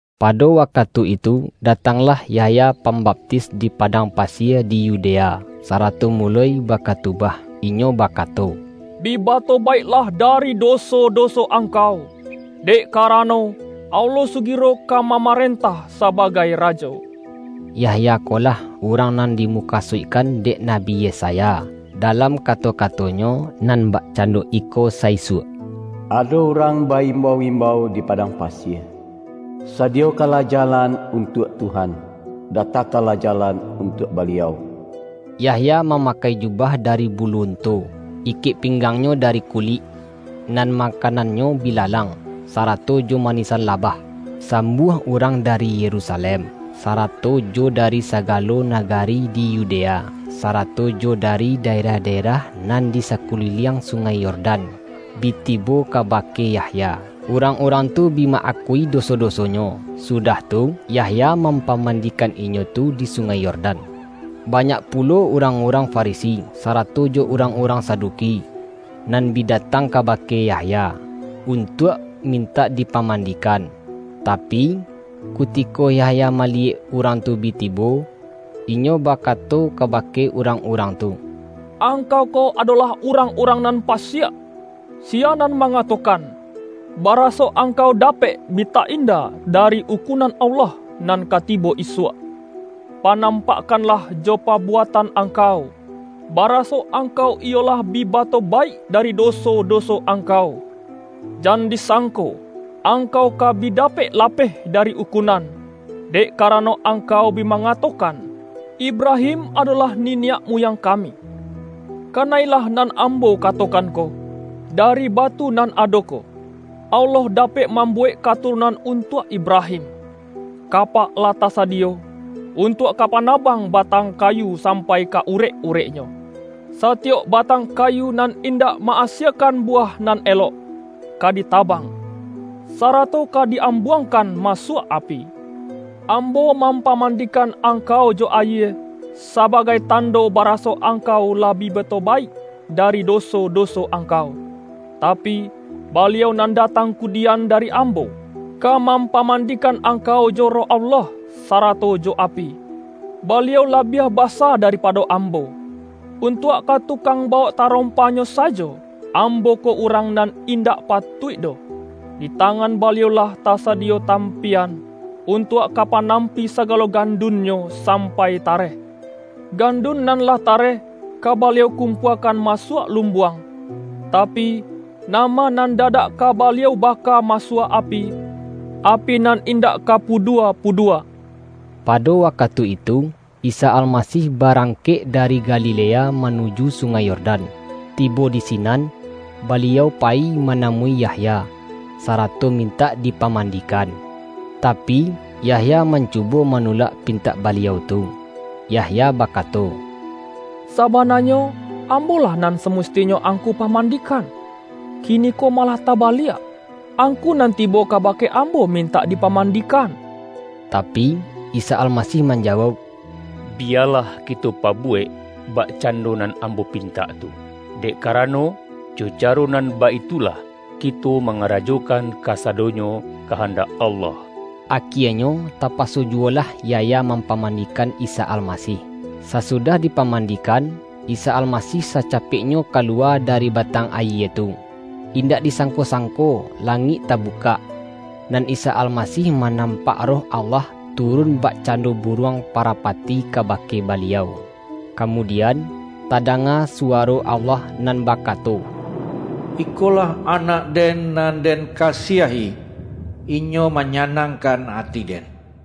Pado wakatu itu, datanglah Yahya Pambaptis di padang pasie di Yudea, sarato muloi bakatubah. Inyo bakato,”Bi batobaiklah dari doso-do-so angkau, dek karano, Allah sugiro ka mamarentah sabagai Rajo!” Yahya ko lah, urang nan dimuka-suikkan dek Nabi Yesaya, dalam kato-katonyo nan bakcando iko sa-isuak,”Ado urang ba-imbau-imbau di padang pasie, ’Sadiyokanlah jalan untuak Tuhan; datakanlah jalan untuak Baliau.’” Yahya mamakai jubah dari bulu unto. Ikek pinggangnyo dari kulik, nan makanannyo bilalang, sarato jo manisan labah. Sambuah urang dari Yerusalem, sarato jo dari sagalo naga-ri di Yudea, sarato jo dari daerah-da-erah nan di sakuliliang Sungai Yordan, bi tibo kabake Yahya. Urang-urang tu bi ma-akui doso-dosonyo, sudah tu, Yahya mampamandikan inyo tu di Sungai Yordan. Banyak pulo urang-urang Farisi, sarato jo urang-urang Saduki, nan bi datang kabake Yahya, untuak min-tak dipamandikan. Tapi, kutiko Yah-ya maliyek urang tu bi tibo, inyo ba-kato kabake urang-urang tu,”Angkau ko adolah urang-urang nan pasiak! Si-ya nan mangatokan, baraso angkau dapek bi ta-inda dari ukunan Allah nan ka tibo isuak? Panampakkan-lah jo pabuatan angkau, baraso ang-kau iyo lah bi batobaik dari doso-do-so angkau. Jan disangko angkau ka bi dapek lapeh dari ukunan, dek ka-rano angkau bi mangatokan, Ibrahim adolah niniak muyang kami. Kana-ilah nan ambo katokan ko, dari batu nan ado ko, Allah dapek mambuwek katurunan untuak Ibrahim! Kapak lah tasadiyo, untuak ka panabang ba-tang kayu sampai ka urek-ureknyo. Satiyok batang kayu nan indak ma-asiekan buwah nan elok, ka ditabang, sarato ka di-ambuangkan masuak api. Ambo mampamandikan angkau jo ayie, sabagai tando baraso angkau lah bi batobaik dari doso-doso angkau, tapi, Baliau nan datang kudian dari ambo, ka mampamandikan angkau jo Roh Allah, sarato jo api. Baliau la-biah basa daripado ambo. Untuak ka tukang bawok tarompa-Nyo sajo, am-bo ko urang nan indak patuik doh. Di tangan Baliau lah tasadiyo tam-piyan, untuak ka panampi sagalo gan-dun-Nyo sampai tareh. Gandun nan lah tareh, ka Baliau kumpuakan ma-suak lumbuang, tapi, nama nan da-dak ka Baliau baka masuak api, api nan indak ka pudua-pudua.” Pado wakatu itu, Isa Almasih ba-rangkek dari Galilea manuju Sungai Yordan. Tibo di sinan, Baliau payi ma-namui Yahya, sarato mintak dipaman-dikan. Tapi, Yahya mancubo manu-lak pintak Baliau tu. Yahya bakato,”Sabananyo, ambolah nan samusti-nyo Angku pamandikan. Kiniko ma-lah tabaliak, Angku nan tibo kabake ambo mintak dipamandikan.” Tapi, Isa Almasih manjawauk,”Bi-yalah kito pabuwek bakcando nan Am-bo pintak tu. Dek karano, jo caro nan baitulah kito mangarajokan kasado-nyo kahandak Allah.” Akienyo, tapa-so juwolah Yahya mampamandikan Isa Almasih. Sasudah dipamandikan, Isa Almasih sacapeknyo kaluwa dari batang ayie tu. Indak disangko-sangko langik ta-bukak, nan Isa Almasih manampak Roh Allah turun bakcando buruang parapati kabake Baliau. Kamudian, tadanga suwaro Allah nan bakato,”Ikolah Anak-Den nan Den kasiahi. Inyo manyanangkan ati-Den.”